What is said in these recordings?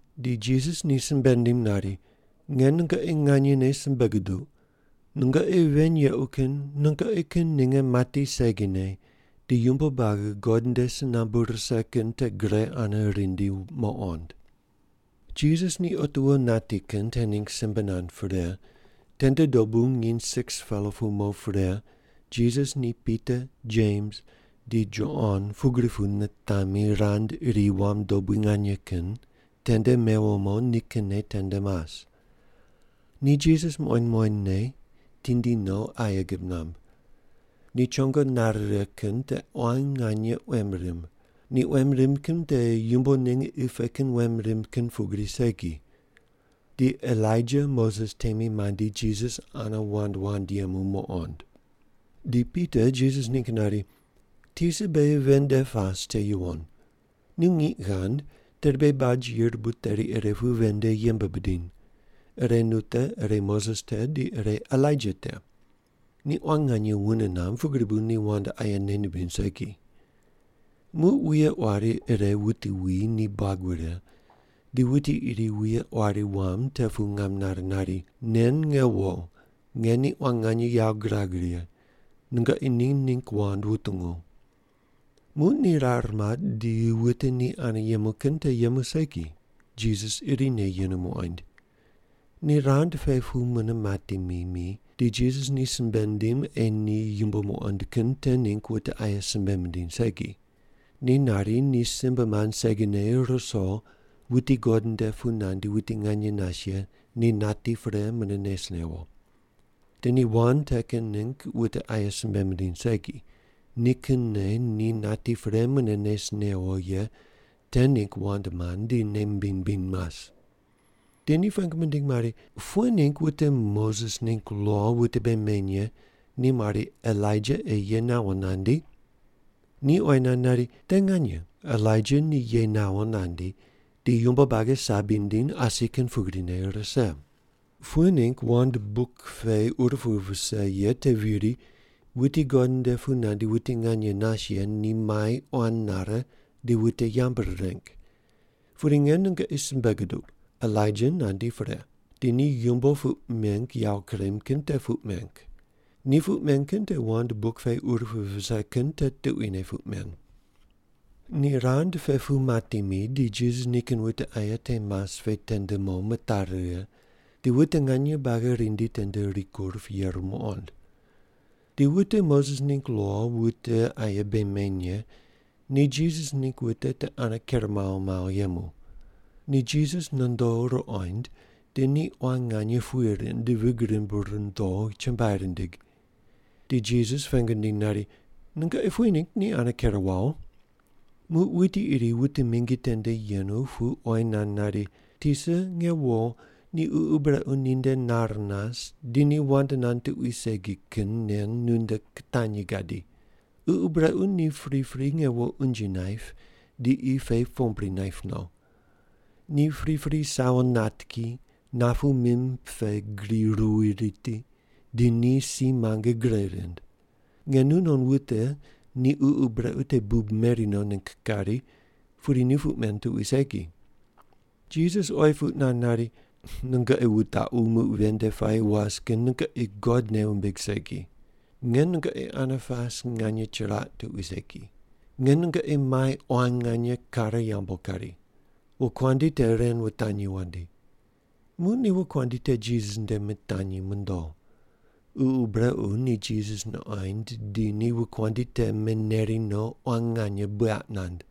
Di Jisas ni simbe nindim nari, “Nge nungoqi nganyene simbe guduq, nungoqi ven yequ kin nungoqi kin ninge mati segine di yumbo buagi God nde si nambu rise kin te gre ane rindi muqond.” Jisas ni otiwo nati kin te ningg simbe nand pre, tende dobu nginy 6-pela pu mo pre Jisas ni Pita, Jems, di Jon pugri pu nitami rand iri wam dobui nganye kin tende mewo mo nikinne tende mas. Ni Jisas muqoind muqoindne tindi no aye gib namb. Ni chongo nare righe kin te quan nganye quem rimb, ni quem rimb kin te yumbo ninge qi pe kin quem rimb kin pugri segi. Di Elaija Moses temi mandi Jisas ane wand wand yemu muqond. Di Pita Jisas ningg nari, “Tisa, beghi ven nde pas te yuwon. Nu ngiq ghand tedi beghi baj yirbu teri ire pu ven nde yembe bidiny. Ire nu te, ire Moses te, di ire Elaija te.” (Ni quan nganye wune mamb, pugri bu ni wand aye nei nimbiny segi.) Muq wuye quari ire wuti wi ni buag wure, di wuti iri wuye quari wam te pu ngam nare nari, “Nen nge wo, nge ni quan nganye yawo girag righe. Nungoqi ni ningg wand wutungu.” Muq ni rar mat di wute ni ane yemu kin te yemu segi, Jisas irine yenu muqoind. Ni rand pe pu mune mati mi mi, di Jisas ni simbe nindim ei ni yumbo muqond kin te ningg wute aye simbe mindiny segi. Ni nari ni simbe mand segine ruso wuti God nde pu nandi wuti nganye nas ye ni nati pre mune nes newo. Di ni wand te kin ningg wute aye simbe mindiny segi, nikinne ni nati pre mune nes newo ye te ningg wand mand di nei mimbiny mimbiny mas. Di ni pengu mindig mari, “Pughe ningg wute Moses ningg lo wute bei meny ye ni mari Elaija ei ye nawo nandi?” Ni oyi nand nari, “Te nganye Elaija ni ye nawo nandi di yumbo buagi sabi nindiny asi kin pugrine rise. Pughe ningg bu wand buk pe ur pu vise ye te viri wuti God nde pu nandi wuti nganye nas ye ni mai quan nare di wute yambu rireng? Pudi nge nungoqi simbe guduq, Elaija nandi pre, di ni yumbo puq meng yawo kurem kin te puq meng. Ni puq men kin te wand buk pe ur pu vise kin te tuquine puq men.” Ni rand pe pu mati mi di Jisas nikin wute aye te mas pe tende mo mitari righe di wute nganye buagi rindi tende rikur pu yeru muqond. Di wute Moses ningg lo wute aye bei meny ye ni Jisas ningg wute te ane ker mawo mawo yemu. Ni Jisas nondo ruqoind di ni quan nganye puye rind di vig rimb rundo chumbuai rindig. Di Jisas ni pengu nindiny nari, “Nungoqi pughe ningg ni ane ker wawo?” Muq wuti iri wute mingi tende yenu pu oyi nand nari, “Tisa, nge wo ni ququ brequ ninde nar nas di ni wand nand tuqui segi kin nen nunde kitanyi gadi. Ququ brequ ni pripri nge wo unje naip di qi pe pombri naip no. Ni pripri sawo nat ki, napu mim pe gri ruwi riti di ni si muange gre rind. Nge nunon wute ni ququ brequ te bub meri no ningg kari, pudi ni puq men tuqui segi.” Jisas oyi puq nand nari, “Nungoqi wutaqu muq ven nde puayi was kin nungoqi God nei wumbig segi. Nge nungoqi ane pas nganye chiraq tuqui segi. Nge nungoqi mai quan nganye kare yambu kari. Wokuandi te ren wutanyi wandi.” Muq ni wokuandi te Jisas nde mitanyi mondo. Ququ brequ ni Jisas nuqoind di ni wokuandi te meneri no quan nganye buyaq nand.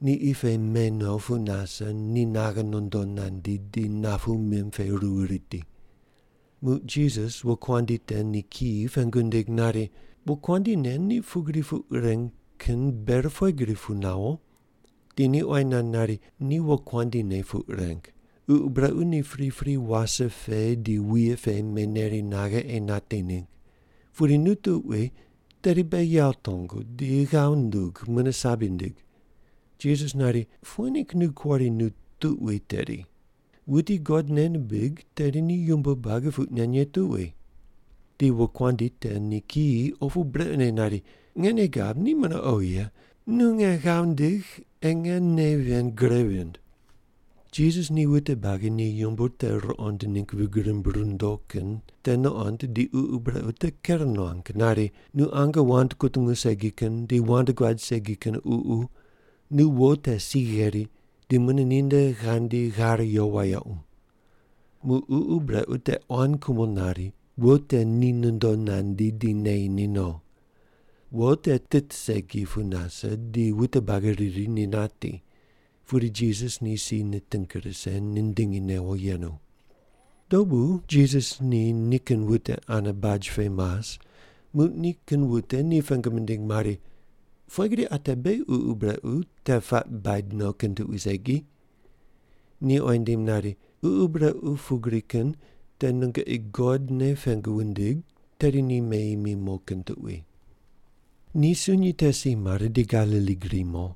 Ni qi pe me no pu nase ni naghe nondo nandi di napu mim pe ruwi riti. Muq Jisas wokuandi te ni kiyi pengu nindig nari, “Wokuandi nen ni pugri puq reng kin ber pughe gri pu nawo?” Di ni oyi nand nari, “Ni wokuandi ne puq reng. Ququ brequ ni pripri wase pe di wuye pe meneri naghe ei nati ningg. Pudi nu tuqui tedi beghi yawo tongu di ghav ndug mune sabi ndig.” Jisas nari, “Pughe ningg nu kuari, ‘Nu tuqui tedi’? Wuti God nei nimbig tedi ni yumbo buagi puq nen ye tuqui.” Di wokuandi te ni kiyi opu brequne nari, “Nge nei gab ni mune oghi ye, nu nge ghav ndigh ei nge nei ven gre vind.” Jisas ni wute buagi ni yumbo te ruqond ningg vig rimb rundo kin te nuqond di ququ brequ te ker nuang nari, “Nu ange wand kutungu segi kin di wand guad segi kin ququ, nu wo te si gheri di mune ninde ghandi ghar yo wayequ.” Muq ququ brequ ni quan kumo nari, wo te ni nondo nandi di neyi ni no. Wo te tit segi pu nase di wute buagi riri ni nati. Pudi Jisas ni si niting rise, nindingi newo yenu. Dobu Jisas ni nikin wute ane baj pe mas muq nikin wute ni pengu mindig mari, “Pughe gri ate beghi ququ brequ te puaq baid no kin tuqui segi?” Ni oyi nindim nari, “Ququ brequ pugri kin te nungoqi God ne pengu wundig tedi ni meyi mi mo kin tuqui.” Ni sunyi te si mare di Galili gri mo.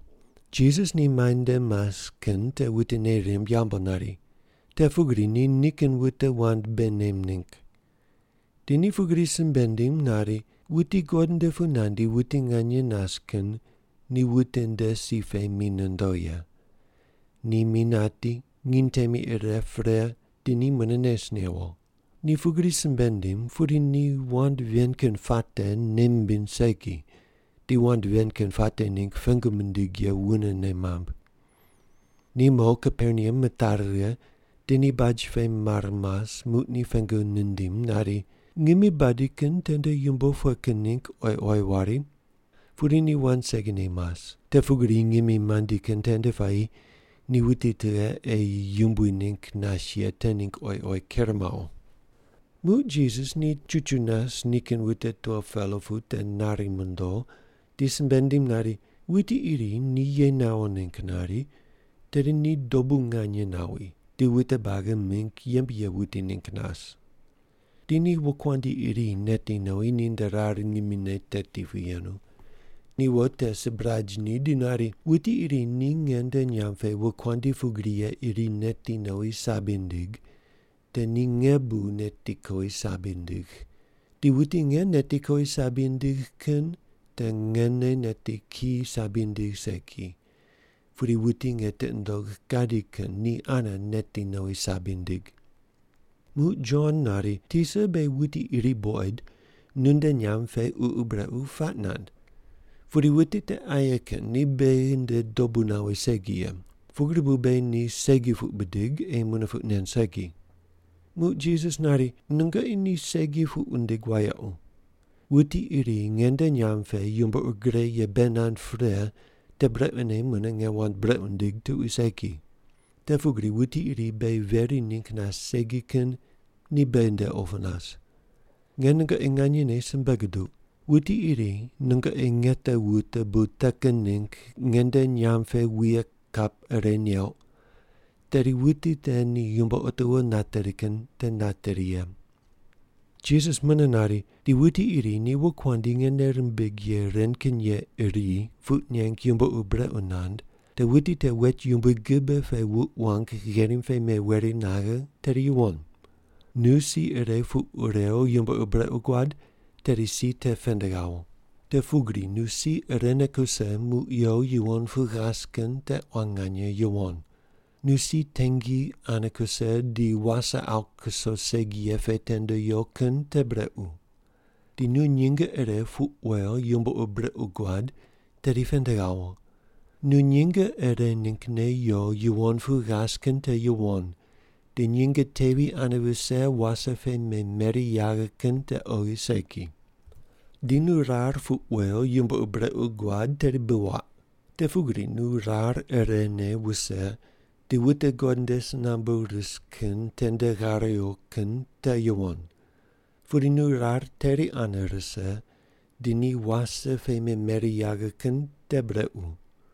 Jisas ni muainde mas kin te wute nei rimb yambu nari. Te pugri ni nikin wute wand bei nem ningg. Di ni pugri simbe nindim nari, “Wuti God nde pu nandi wuti nganye nas kin ni wute nde si pe mi nondo ye. Ni mi nati, nginy temi ire pre di ni mune nes newo.” Ni pugri simbe nindim, pudi ni wand ven kin puate nei mimbiny segi di wand ven kin puate ningg pengu mindig ye wunene mamb. Ni mo Kaperneam mitari righe di ni baj pe mar mas muq ni pengu nindim nari, “Ngimi badi kin tende yumbo pughe kin ningg oyi oyi wari?” Pudi ni wand segine mas, te pugri ngimi mandi kin tende puayi ni wuti tughe ei yumbui ningg nas ye te ningg oyi oyi ker mawo. Muq Jisas ni chuchu nas nikin wute 12-pela pu te nari mondo di simbe nindim nari, “Wuti iri ni ye nawo ningg nari, tedi ni dobu nganye nawi di wute buagi mingg yembe ye wuti ningg nas.” Di ni wokuandi iri neti nowi ninde rar ngimine teti pu yenu. Ni wo te sibraj ni di nari, “Wuti iri ni nge nde nyamb pe wokuandi pugri ye iri neti nowi sabi nindig, te ni nge bu neti kowi sabi nindigh, di wuti nge neti kowi sabi nindigh kin te ngene neti ki sabi nindigh segi, pudi wuti nge tiqi nundogh gadi kin ni ane neti nowi sabi nindig.” Muq Jon nari, “Tisa, beghi wuti iri buqoid nu nde nyamb pe ququ brequ puaq nand. Pudi wuti te aye kin, ni beghi nde dobu nawi segi ye. Pugri bu beghi ni segi puq bidig ei mune puq nen segi.” Muq Jisas nari, “Nungoqi ni segi puq wundig wayequ. Wuti iri nge nde nyamb pe yumbo ur gre ye bei nand pre te brequne mune nge wand brequ nindigh tuqui segi. Te pugri wuti iri beghi veri ningg nas segi kin ni beghi nde opu nas. Nge nungoqi nganyene simbe guduq, wuti iri nungoqi nge te wute bu te kin ningg nge nde nyamb pe wuye kap ire neuq, tedi wuti te ni yumbo otiwo nateri kin te nateri ye.” Jisas mune nari, “Di wuti iri ni wokuandi nge nei rimbigh ye ren kin ye iri puq neng yumbo ur brequ nand, te wuti te wet yumbui gibe pe wuq wang gherim pe meweri naghe tedi yuwon. Nu si ire puq rew yumbo ur brequ guad, tedi si te pend ghawo. Te pugri nu si irene kuse muq yo yuwon pu ghas kin te quan nganye yuwon. Nu si tengi ane kuse di wase awu kuso segi ye pe tende yo kin te brequ. Di nu nyinge ire puq wew yumbo ur brequ guad tedi pend ghawo. Nu nyinge ire ninggne yo yuwon pu ghas kin te yuwon, di nyinge tevi ane vise wase pe memeri yaghe kin te oghi segi. Di nu rar puq wew yumbo ur brequ guad, tedi bi waq. Te pugri nu rar irene wuse di wute God nde si nambu ris kin tende ghar yo kin te yuwon. Pudi nu rar teri ane rise di ni wase pe memeri yaghe kin te brequ.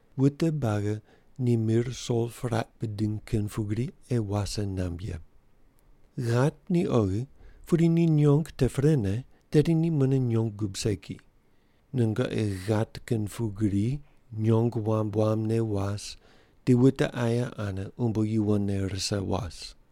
Wute buagi ni mir sol puraq bidiny kin pugri ei wase namb ye. “Ghat ni oghi, pudi ni nyong te prene, tedi ni mune nyong gub segi. Nungoqi ghat kin pugri nyong wamb wambne was di wute aye ane umbo yuwonne rise was.”